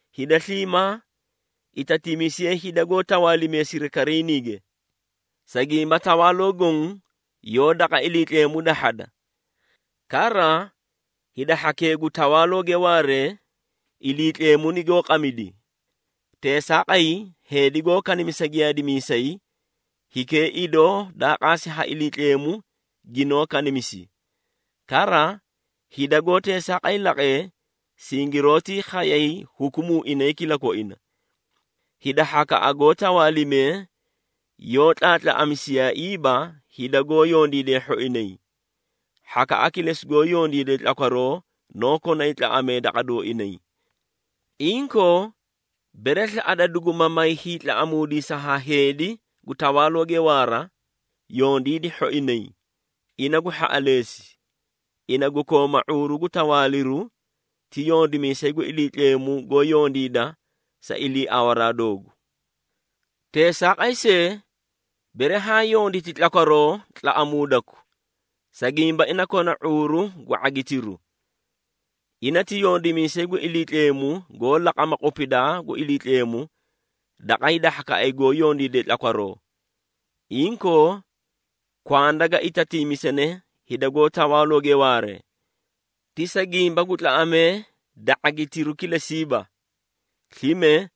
Hida sliimaa itatiimisiyee hida goó tawaalimee sirikariiniige, sa gimba tawaaloo goõ yoó daqa Iliitleemu dahhada. Kara, hida hhakee gu tawaalooge waaree, Iliitleemu nigoó qamidi. Teesaaqay, heedi goó kanimisa giyaadimiisay, hikee idoo daa qaasi ha Iliitleemu ginoó kanimisi. Kara, hida goó teesaaqay laqee, singiroótii khayay hukumuu inay kilakoina. Hida hhakaꞌa goó tawaalimee yoó tlaatlaꞌamisiyaaiiba hida goó yondiidee hhoinay, hhakaꞌa kilesi goó yondiide tlakwaroo noó konay tlaꞌamee daqa dooinay. Inkoo, bere slaꞌada duguma may hiitlaꞌamuudisa ha heedi gu tawaalooge waara, yondiidi hhoinay, ina gu hhaꞌaleesi. Ina gu kooma ⁄uuru gu tawaaliru ti yondimiisay gu Iliitleemu goó yondiida sa iliiawaraa doogu. Teesaaqay see, bere haã yonditi tlakwaroo tlaꞌamuudaku, sa gimba ina kona ⁄uuru gu ⁄agitiru. Ina ti yondimiisay gu Iliitleemu goó laqama qupidaa gu Iliitleemu daqa hida hhakaꞌay goó yondiidee tlakwaroo. Inkoo, kwanda ga itatiimisane hida gu tawaalooge waaree, ti sa gimba gu tlaꞌamee da ⁄agitiru kilesiiba. Slime,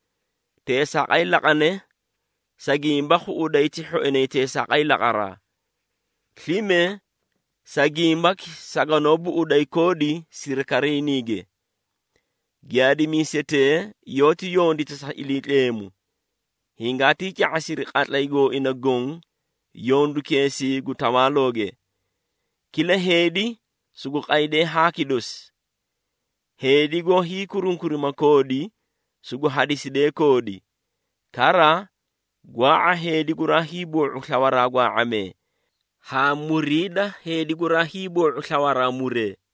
teesaaqay laqane, sa gimba khuꞌuday ti hhoinay teesaaqay laqaraa. Slime sa gimbaki saganoó buꞌuday koodi sirikariiniige. Giyaadimiisetee yoóti yondita sa Iliitleemu, hingaatii ca⁄asiri qatlay gooinay goõ yondukeesii gu tawaalooge. Kila heedi sugu qaydee haaki dosi. Heedi goó hiikurunkurima koodi, sugu hadiside koodi. Kara, gwaa⁄a heedi guraa hiiboo⁄u slawaraa gwaa⁄amee haa muriida heedi guraa hiiboo⁄u slawaraa muree.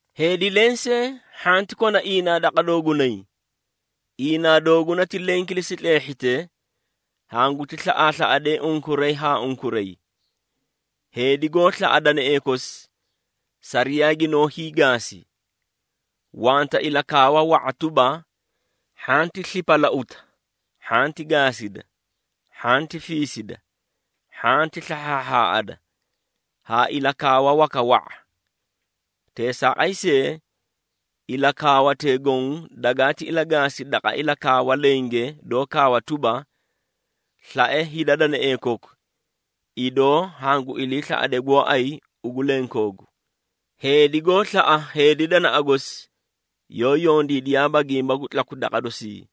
Heedi lensee hhanti kona iinaa daqa doogunay. Iinaa dooguna ti leẽ kilesi tleehhite, hanguti slaꞌaaslaꞌadee unkuray haa unkuray. Heedi goó slaꞌa danaee kosi sariyaa ginoó hiigaasi. Wanta ilakaawa wa⁄a tuba, “Hhanti slipalauta, hhanti gaasida, hhanti fiisida, hhanti slahhaahhaaꞌada,” haa ilakaawa waka wa⁄a. Teesaaqay see, ilakaawatee goõ dagati ilagaasi daqa ilakaawa lenge doó kaawa tuba, “Slae hida danaee koku, idoo hangu iliislaꞌade gooay ugu lenkoogu.” Heedi goó slaꞌa heedi danaꞌa gosi, yoó yondiidiyaaba gimba gu tlaku daqa dosii.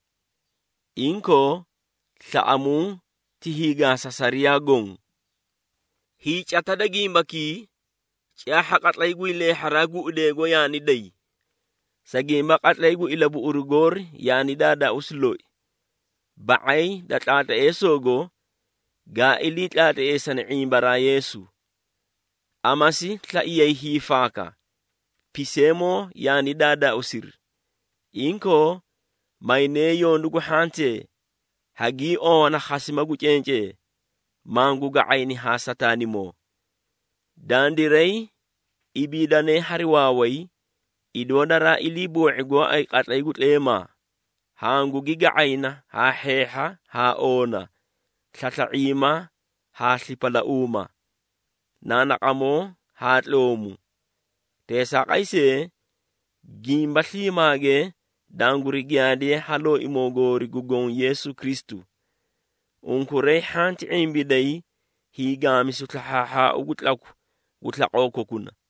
Inkoo, slaꞌamuu ti hiigaasa sariyaa goõ. Hiicata da gimbakii, caahha qatlay gu hiileehharaa guꞌudeego yaani day. Sa gimba qatlay gu ilabuꞌuru goori yaani daadaausi loi, ba⁄ay da tlaatleesogo gaa ilii tlaatleesani ⁄imbaraa Yeesu. Amasi slaiyay hiifaaka, piseemoo yaani daadaauusiri. Inkoo, maynee yondu gu hhantee, haagii owana khasima gu cencee, mangu ga⁄ayni haa Sataanimoo. Dandiray ibiidanee hari waaway, idoo daraa iliiboo⁄i gooay qatlay gu tleemaa, hangugi ga⁄ayna haa hheehha haa oona, slasla⁄iima haa slipalauuma, naanaqamoo haa tloomu. Teesaaqay see, gimba sliimaage danguri giyaadiye ha Looimoo goori gu Goõ Yeesu Kristu. Unkuray hhanti ⁄imbiday hiigaamisu slahhaahhaau gu tlaku gu slaqoo kokuna.